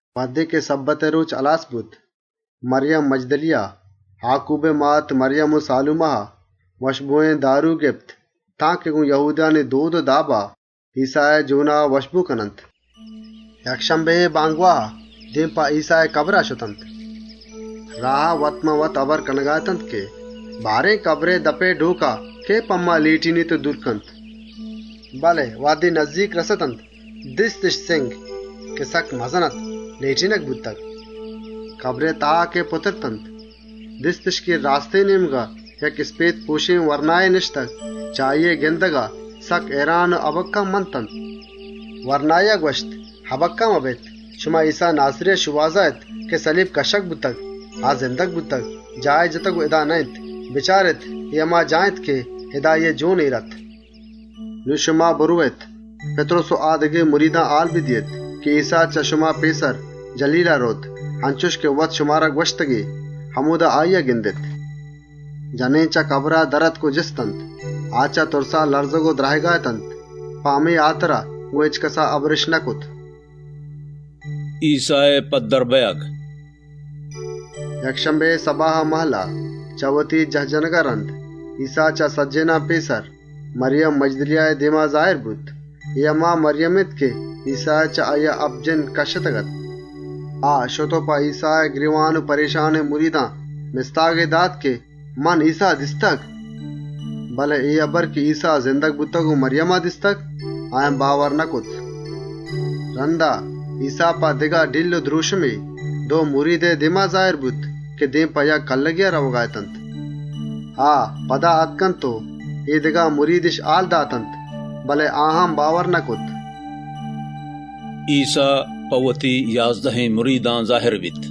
‏ وهدے شَبَّتئے رۆچ هلاس بوت، مَریم مَجْدَلیَه، آکوبئے مات مَریم و سالومَها، وشبۆێن دارو گپت که ایسّائے جۆنا چرپ کننت. ‏ یکشَمبِهئے بامگواها، دێم په ایسّائے کَبرئے سرا شتنت. ‏ راها، وت‌مان‌وت هبر کنگا اتنت که: «بارێن، کَبرئے دَپئے ڈۆکا، کئے په ما لێٹێنیت و دورَ کنت؟» ‏ بله وهدے نزّیک رَستنت دیستِش ڈۆک، که سکّ مزن اَت، لێٹێنگ بوتگ. ‏ کَبرا که پُترتنت، دیستِش که راستێن نێمگا یک اِسپێت‌پۆشێن ورنایے نِشتگ. چه آییئے گِندگا، سکّ هئیران و هَبَکَّه منتنت. ‏ وَرنایا گوَشت: «متُرسێت، شما ایسّا ناسِریئے شۆهازا اێت که سَلیب کَشّگ بوتگ. آ زندگ بوتگ، جاهی جتگ و اِدا نه‌اِنت. بچارێت، اے هما جاگه اِنت که اِدا آییئے جۆن اێر اَت. ‏ نون شما برئوێت، پِتْرُس و آ دگه مریدان سهیگ کنێت که ایسّا چه شما پێسر، جَلیلا رئوت. انچُش که وت شمارا گوَشتگ‌اَتی، همۆدا آییا گندێت.» ‏ جنێن در آتک و چه کَبرئے سرا جِستنت. آ چه تُرسا لَرزگ و درَهگا اتنت. پمێشکا، گۆن هچکَسا هبرِش نکرت. ایسّائے زاهر بئیگ ‏ یکشَمبِهئے سَباها ماهَلّه، چه وتی جاه جنَگا رَند، ایسّا چه سجّهێنان پێسر، مَریم مَجْدَلیَهئے دێما پَدّر بوت. اے هما مَریم اِنت که ایسّایا چه آییا هپت جِنّ کَشّتگ‌اَت. ‏ آ شت و ایسّائے گرێوان و پرێشانێن مریدی مستاگ داتنت که: «من ایسّا دیستگ.» ‏ بله اے هبر که ایسّا زندگ بوتگ و مَریما دیستگ، آیان باور نکرت. ‏ رَندا، ایسّا دگه شِکل و دْرۆشمێا، دو مریدئے دێما زاهر بوت که دێم په یک کلّگێا رئوگا اتنت. ‏ آ، پدا آتکنت و اے دگه مریدِش هال داتنت، بله آیان هم باور نکرت. ایسّا په وتی یازدهێن مریدان زاهرَ بیت ‏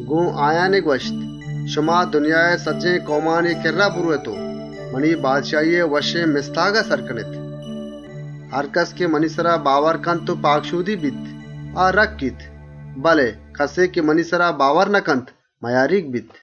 گۆن آیان گوَشتی: «شما دنیائے سجّهێن کئومانی کِرّا برئوێت و وشّێن مستاگا سر کنێت. ‏ هرکَس که منی سرا باورَ کنت و پاکشۆدیَ کنت، آ رَکّیت. بله کَسے که منی سرا باورَ نکنت، مئیاریگَ بیت. ‏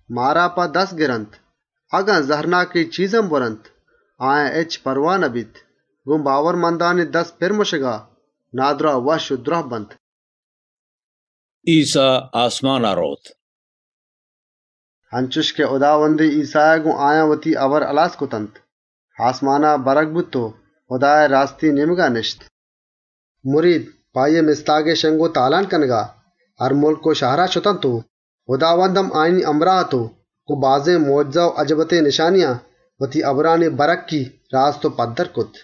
ماران په دستَ گرنت و اگن زَهرناکێن چیز هم بوَرنت، آیان هچ پرواهَ نبیت. گۆن باورمندانی دست پِر مُشَگا، نادْراه وشّ و دْراهَ بنت.» ایسّا آسمانا رئوت ‏ انچُش که هُداوندێن ایسّایا گۆن آیان وتی هبر هلاس کرتنت، آسمانا برگ بوت و هُدائے راستێن نێمگا نِشت. ‏ مرید، په آییئے مستاگئے شِنگ و تالان کنگا، هر مُلک و شهرا شتنت و هُداوند هم آیانی همراه اَت و آییا گۆن بازێن مۆجزه و اَجَبَّتێن نشانیان، وتی هبرانی بَرهَکّی، راست و پَدّر کرت.